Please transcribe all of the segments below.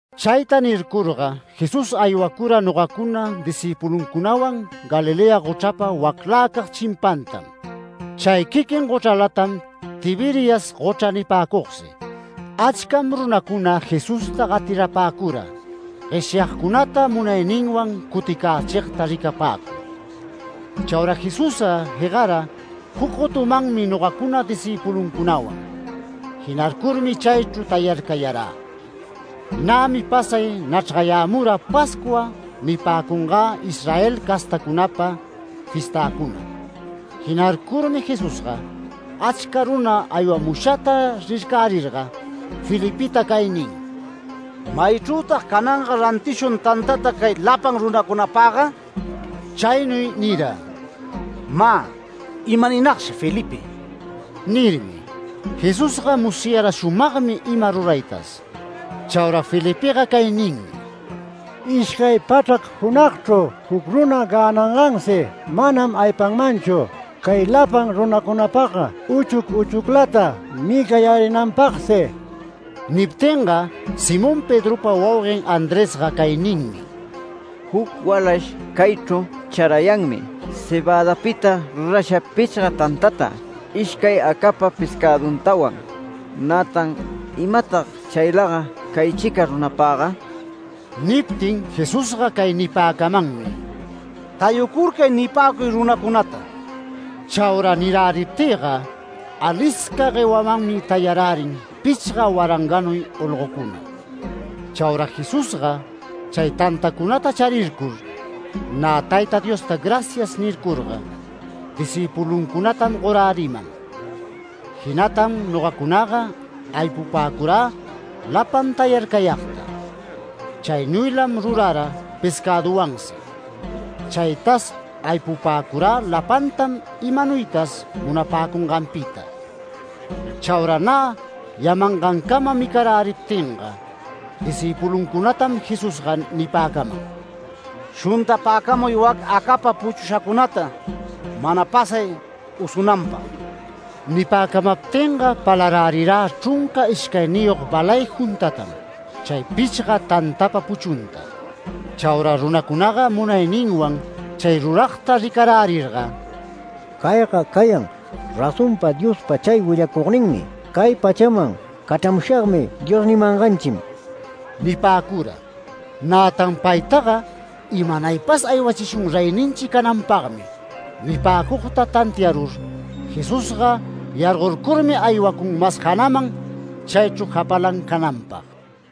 Chayta nircurga Jesús aywacura nogacuna, discïpuluncunawan Galilea gochrapa wacläcag chimpantam. Chay quiquin gochralatam Tiberias gochra nipäcugsi. Achcam runacuna Jesusta gatirapäcura, gueshyagcunata munayninwan cuticächigta ricapäcur. Chaura Jesusga jegara juc gotumanmi nogacuna discïpuluncunawan. Jinarcurmi chaychru tayarcayarä. Nämi pasay nachrgayämura Pascua nipäcunagä, Israel castacunapa fiestäcuna. Jinarcurmi Jesusga achca runa aywamushata rircärirga Felipeta cay nin: “¿Maychrütag cananga rantishun tantata cay lapan runacunapagga?” Chaynuy nira: “Mä ¡imaninagshi Felipe!” nirmi. Jesusga musyara shumagmi ima ruraytas. Chaura Felipega cay ninmi: “Ishcay pachrac junagchru juc runa gänangansi manam aypanmanchu, cay lapan runacunapagga uchuc uchuclata micayärinanpagsi”. Niptinga Simón Pedropa wauguen Andresga cay ninmi: “Juc walash caychru charayanmi cebädapita rurasha pichga tantata, ishcay acapa pescäduntawan. Nätan ¿imatag chaylaga caychica runapagga?” Niptin Jesusga cay nipäcamanmi: “Tayucurcay nipäcuy runacunata”. Chaura niräriptïga, alisca guewamanmi tayarärin pichga waranganuy olgocuna. Chaura Jesusga chay tantacunata charircur nä Tayta Diosta “Gracias” nircurga discïpuluncunatam goräriman. Jinatam nogacunaga aypupäcurä lapan tayarcayagta. Chaynuylam rurara pescäduwansi. Chaytas aypupäcurä lapantam imanuytas munapäcunganpita. Chaura nä yamangancama micaräriptinga, discïpuluncunatam Jesusga nipäcaman: “Shuntapäcamuy wac acapa puchushacunata mana pasay usunanpag”. Nipäcamaptinga palarärirä chrunca ishcayniyog balay juntatam, chay pichga tantapa puchunta. Chaura runacunaga munayninwan chay ruragta ricarärirga “Cayga cayan razonpa Diospa chay willacugninmi ‘Cay pachaman cachramushagmi’ Dios nimanganchim” nipäcura. Nätan paytaga “¡Imanaypas aywachishun reyninchi cananpagmi!” nipäcugta tantiarur Jesusga yargorcurmi aywacun mas janaman chaychru japalan cananpag.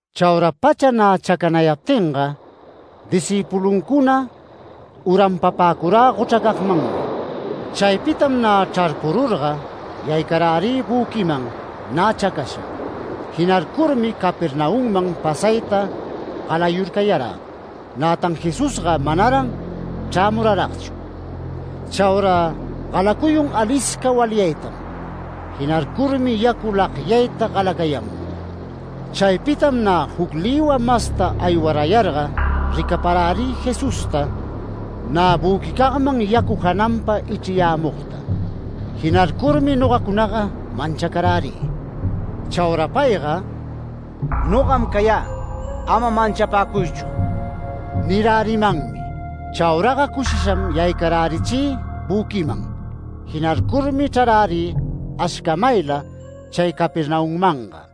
Chaura pacha nä chacanayaptinga, discïpuluncuna uranpapäcurä gochracagmanmi. Chaypitam nä chrarpururga yaycarärï büquiman nä chacasha. Jinarcurmi Capernaumman pasayta galayurcayarä, nätan Jesusga manaran chrämuraragchu. Chaura galacuyun alisca walyaytam. Jinarcurmi yacu lagyayta galacayamun. Chaypitam nä juc lïwa masta aywarayarga ricaparärï Jesusta nä büquicagman yacu jananpa ichriyämugta. Jinarcurmi nogacunaga manchacarärï. Chaura payga “Nogam cayä. Ama manchapäcuychu” nirärimanmi. Chauraga cushisham yaycarärichï büquiman. Jinarcurmi chrarärï ashcamayla chay Capernaummanga.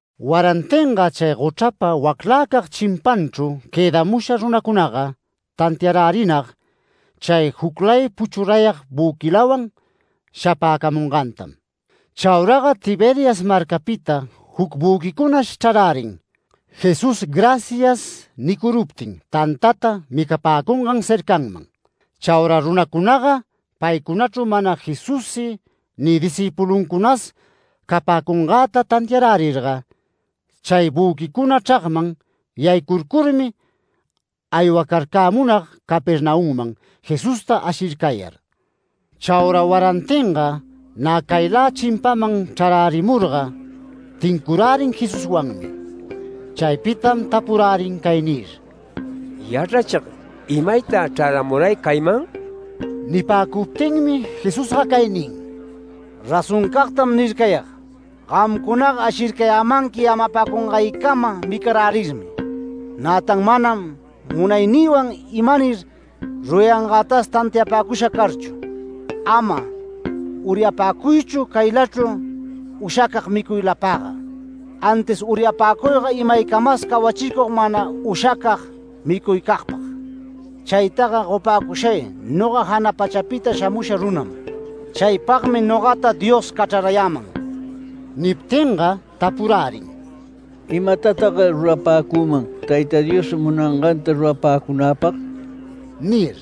Warantinga chay gochrapa waclacag chimpanchru quëdamusha runacunaga tantiarärinag chay juclay puchurayag büquilawan shapäcamungantam. Chauraga Tiberias marcapita juc büquicunash chrarärin Jesús “Gracias” nicuruptin tantata micapäcungan cercanman. Chaura runacunaga paycunachru mana Jesussi ni discïpuluncunas capäcungäta tantiarärirga chay büquicuna chragman yaycurcurmi aywacarcämunag Capernaumman Jesusta ashircayar. Chaura warantinga nä caylä chimpaman chrarärimurga tincurärin Jesuswanmi. Chaypitam tapurärin cay nir: “Yachrachig, ¿imaytag chraramuray cayman?” Nipäcuptinmi Jesusga cay nin: “Razoncagtam nircayag: Gamcunaga ashircayämanqui yamapäcungaycama micarärirmi. Nätan manam munaynïwan imanir rurangätas tantiapäcusha carchu. Ama uryapäcuychu caylachru ushacag micuylapagga, antis uryapacuyga imaycamas cawachicug mana ushacag micuycagpag. Chaytaga gopäcushay noga jana pachapita shamusha runam. Chaypagmi nogata Dios cachrayäman”. Niptinga tapurärin: “¿Imatatag rurapäcüman, Tayta Dios munanganta rurapäcunäpag?” nir.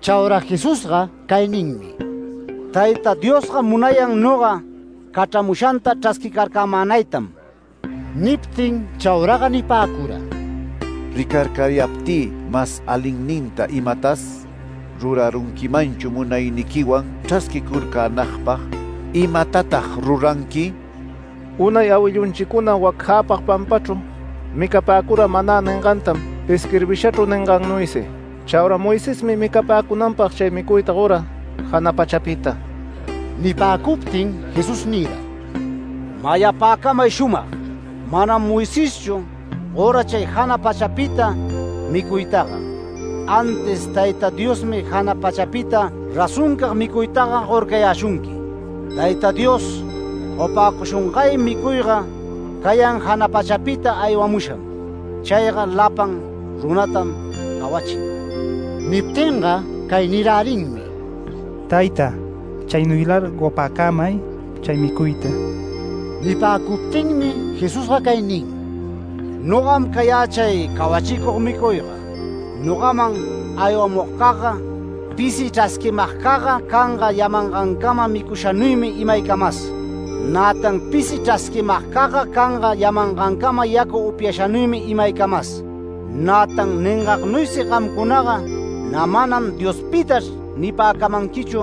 Chaura Jesusga cay ninmi: “Tayta Diosga munayan noga, cachramushanta chrasquicarcämänaytam”. Niptin chauraga nipäcura: “¿Ricarcayaptï mas alinninta imatas rurarunquimanchu munayniquiwan chrasquicurcänagpag? ¿Imatatag ruranqui? Unay awillunchicuna wac jäpag pampachru micapäcura ‘manä’ ningantam isquirbishachru ningannuysi: Chaura Moisesmi micapäcunanpag chay micuyta gora jana pachapita”. Nipäcuptin Jesús nira: “Mayapäcamay shumag: Manam Moiseschu gora chay jana pachapita micuytaga, antis Tayta Diosmi jana pachapita razoncag micuytaga gorcayäshunqui. Tayta Dios gopäcushungay micuyga cayan jana pachapita aywamusham. Chayga lapan runatam cawachin”. Niptinga cay nirärinmi: “Tayta, chaynuylar gopäcamay chay micuyta”. Nipäcuptinmi Jesusga cay nin: “Nogam cayä chay cawachicug micuyga. Nogaman aywamugcagga pisi chrasquimagcagga canga yamangancama micushanuymi imaycamas. Nätan pisi chrasquimagcagga canga yamangancama yacu upyashanuymi imaycamas. Nätan ningagnuysi gamcunaga nä manam ‘Diospitachr’ nipäcamanquichu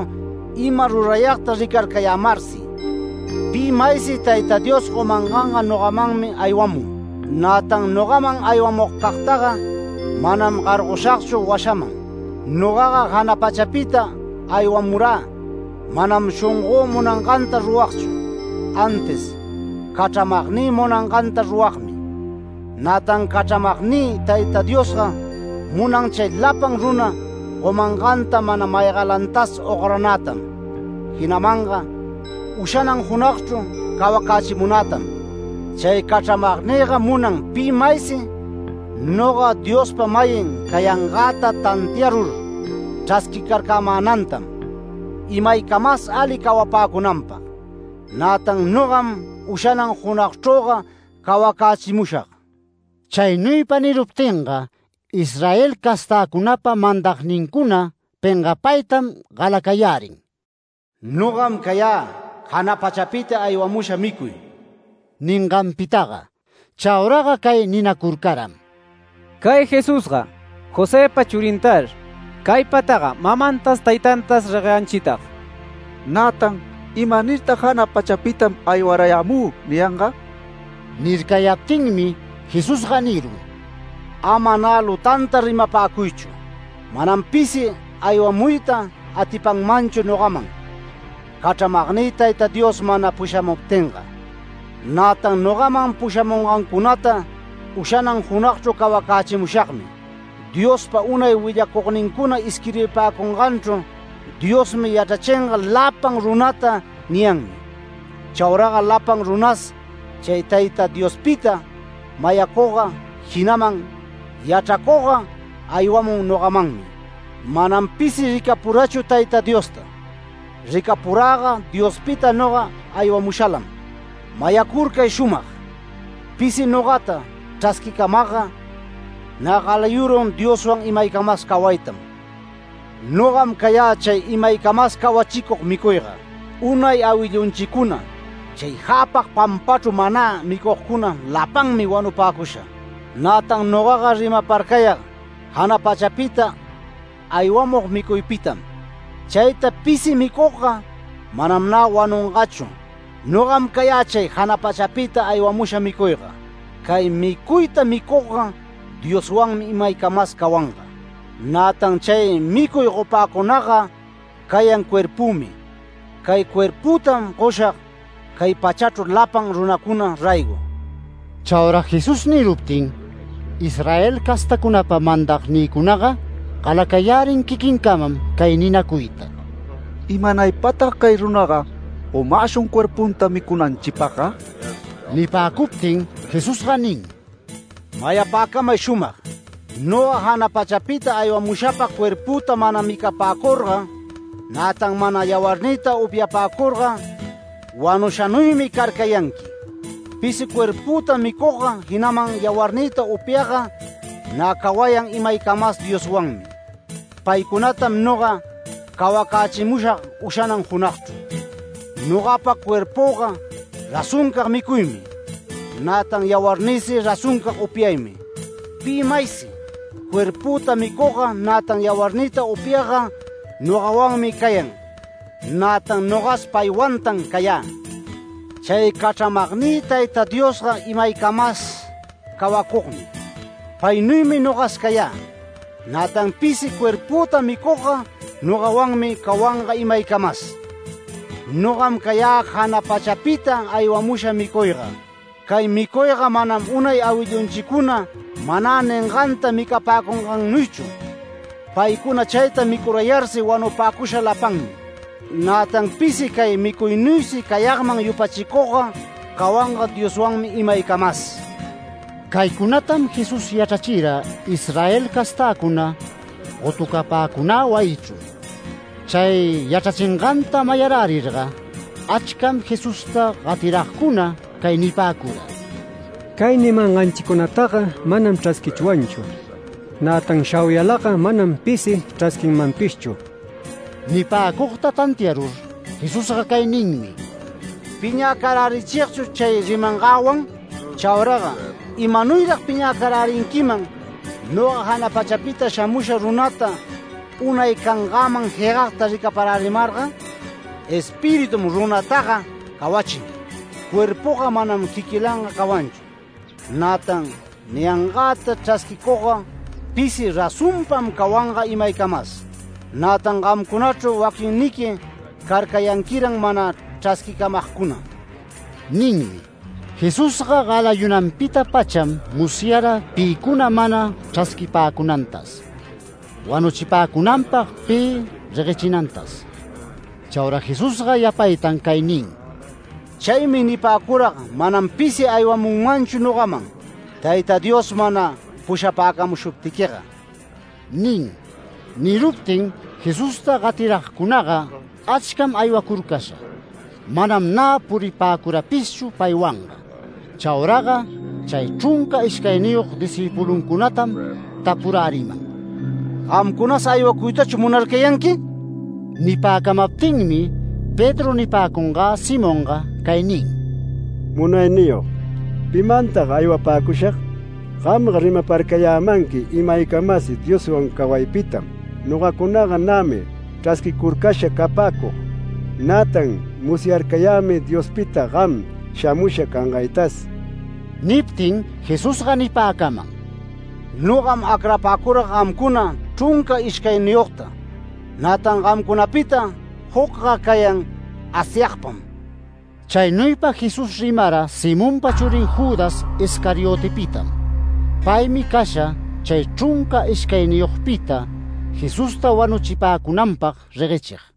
ima rurayagta ricarcayämarsi. Pi maysi Tayta Dios gomanganga nogamanmi aywamun. Nätan nogaman aywamugcagtaga manam gargoshagchu washaman. Nogaga jana pachapita aywamurä manam shongö munanganta ruragchu, antis cachramagnï munanganta ruragmi. Nätan cachramagnï Tayta Diosga munan chay lapan runa gomanganta mana maygalantas ogranätam, jinamanga ushanan junagchru cawacächimunätam. Chay cachramagnïga munan pi maysi noga Diospa-mayin cayangäta tantiarur chrasquicarcämänatam, imaycamas ali cawapäcunanpag. Nätan nogam ushanan junagchrüga cawacächimushag”. Chaynuypa niruptinga Israel castäcunapa mandagnincuna pengapaytam galacayärin “Nogam cayä jana pachapita aywamusha micuy” ninganpitaga. Chauraga cay ninacurcaram: “Cay Jesusga Josëpa churintar. Caypataga mamantas taytantas regueyanchitag. Nätan ¿imanirtag ‘Jana pachapitam aywarayämü’ niyanga?” Nircayaptinmi Jesusga nirun: “Ama nä lutanta rimapäcuychu. Manam pisi aywamuyta atipanmanchu nogaman, cachramagnï Tayta Dios mana pushamuptinga. Nätan nogaman pushamungancunata ushanan junagchru cawacächimushagmi. Diospa unay willacugnincuna isquirbipäcunganchru ‘Diosmi yachrachinga lapan runata’ niyanmi. Chauraga lapan runas chay Tayta Diospita mayacugga, jinaman yachracugga aywamun nogamanmi. Manam pisi ricapurachu Tayta Diosta. Ricapuräga Diospita noga aywamushalam. Mayacurcay shumag: Pisi nogata chrasquicamagga, nä galayurun Dioswan imaycamas cawaytam. Nogam cayä chay imaycamas cawachicug micuyga. Unay awillunchicuna chay jäpag pampachru ‘manä’, micugcuna lapanmi wanupäcusha. Nätan nogaga rimaparcayag jana pachapita aywamug micuypitam. Chayta pisi micugga manam nä wanungachu. Nogam cayä chay jana pachapita aywamusha micuyga. Cay micuyta micugga Dioswanmi imaycamas cawanga. Nätan chay micuy gopäcunagga cayan cuerpümi. Cay cuerpütam goshag cay pachachru lapan runacuna raygo”. Chaura Jesús niruptin, Israel castäcunapa mandagcunaga galacayärin quiquincamam cay ninacuyta: “¿Imanaypatag cay runaga gomäshun cuerpunta micunanchipagga?” Nipäcuptin Jesusga nin: “Mayapäcamay shumag: Noga jana pachapita aywamushapa cuerpüta mana micapäcurga, nätan mana yawarnïta upyapäcurga wanushanuymi carcayanqui. Pisi cuerpüta micugga jinaman yawarnïta upyagga nä cawayan imaycamas Dioswanmi. Paycunatam noga cawacächimushag ushanan junagchru. Nogapa cuerpüga razoncag micuymi, nätan yawarnïsi razoncag upyaymi. Pi maysi cuerpüta micugga nätan yawarnïta upyagga nogawanmi cayan, nätan nogas paywantan cayä. Chay cachramagnï Tayta Diosga imaycamas cawacugmi. Paynuymi nogas cayä, nätan pisi cuerpüta micugga noganuymi cawanga imaycamas. Nogam cayä jana pachapita aywamusha micuyga. Cay micuyga manam unay awillunchicuna ‘manä’ ninganta micapäcungannuychu. Paycuna chayta micurayarsi wanupäcusha lapanmi. Nätan pisi cay micuynuysi cayagman yupachicugga cawanga Dioswanmi imaycamas”. Caycunatam Jesús yachrachira Israel castäcuna gotucapäcunä wayichru. Chay yachrachinganta mayarärirga achcam Jesusta gatiragcuna cay nipäcura: “Cay nimanganchicunataga manam chrasquichwanchu. Nätan shauyalaga manam pisi chrasquinmanpishchu”. Nipäcugta tantiarur Jesusga cay ninmi: “¿Piñäcarärichigchu chay rimangäwan? Chauraga ¿imanuyrag piñäcarärinquiman, noga jana pachapita shamusha runata unay cangäman jegagta ricaparärimarga? Espiritum runataga cawachin. Cuerpuga manam quiquilanga cawanchu. Nätan niyangäta chrasquicugga pisi razonpam cawanga imaycamas. Nätan gamcunachru waquinniqui carcayanquiran mana chrasquicamagcuna” ninmi. Jesusga galayunanpita-pacham musyara pïcuna mana chrasquipäcunantas, wanuchipäcunanpag pi reguechinantas. Chaura Jesusga yapaytan cay nin: “Chaymi nipäcurag manam pisi aywamunmanchu nogaman, Tayta Dios mana pushapäcamushuptiquiga” nin. Niruptin, Jesusta gatiragcunaga achcam aywacurcasha, manam nä puripäcurapishchu paywanga. Chauraga chay chrunca ishcayniyog discïpuluncunatam tapuräriman: “¿Gamcunas aywacuytachu munarcayanqui?” Nipäcamaptinmi Pedro nipäcungä Simonga cay nin: “Munayniyog, ¿pimantag aywapäcushag? Gamga rimaparcayämanqui imaycamas Dioswan cawaypitam. Nogacunaga nämi chrasquicurcasha capäcug. Nätan musyarcayämi Diospita gam shamusha cangaytas”. Niptin Jesusga nipäcaman: “Nogam acrapäcurag gamcuna, chrunca ishcayniyogta, nätan gamcunapita jucga cayan Asyagpam”. Chaynuypa Jesús rimara Simonpa churin Judas Iscariotepitam. Paymi casha chay chrunca ishcayniyogpita Jesusta wanuchipäcunanpag reguechig.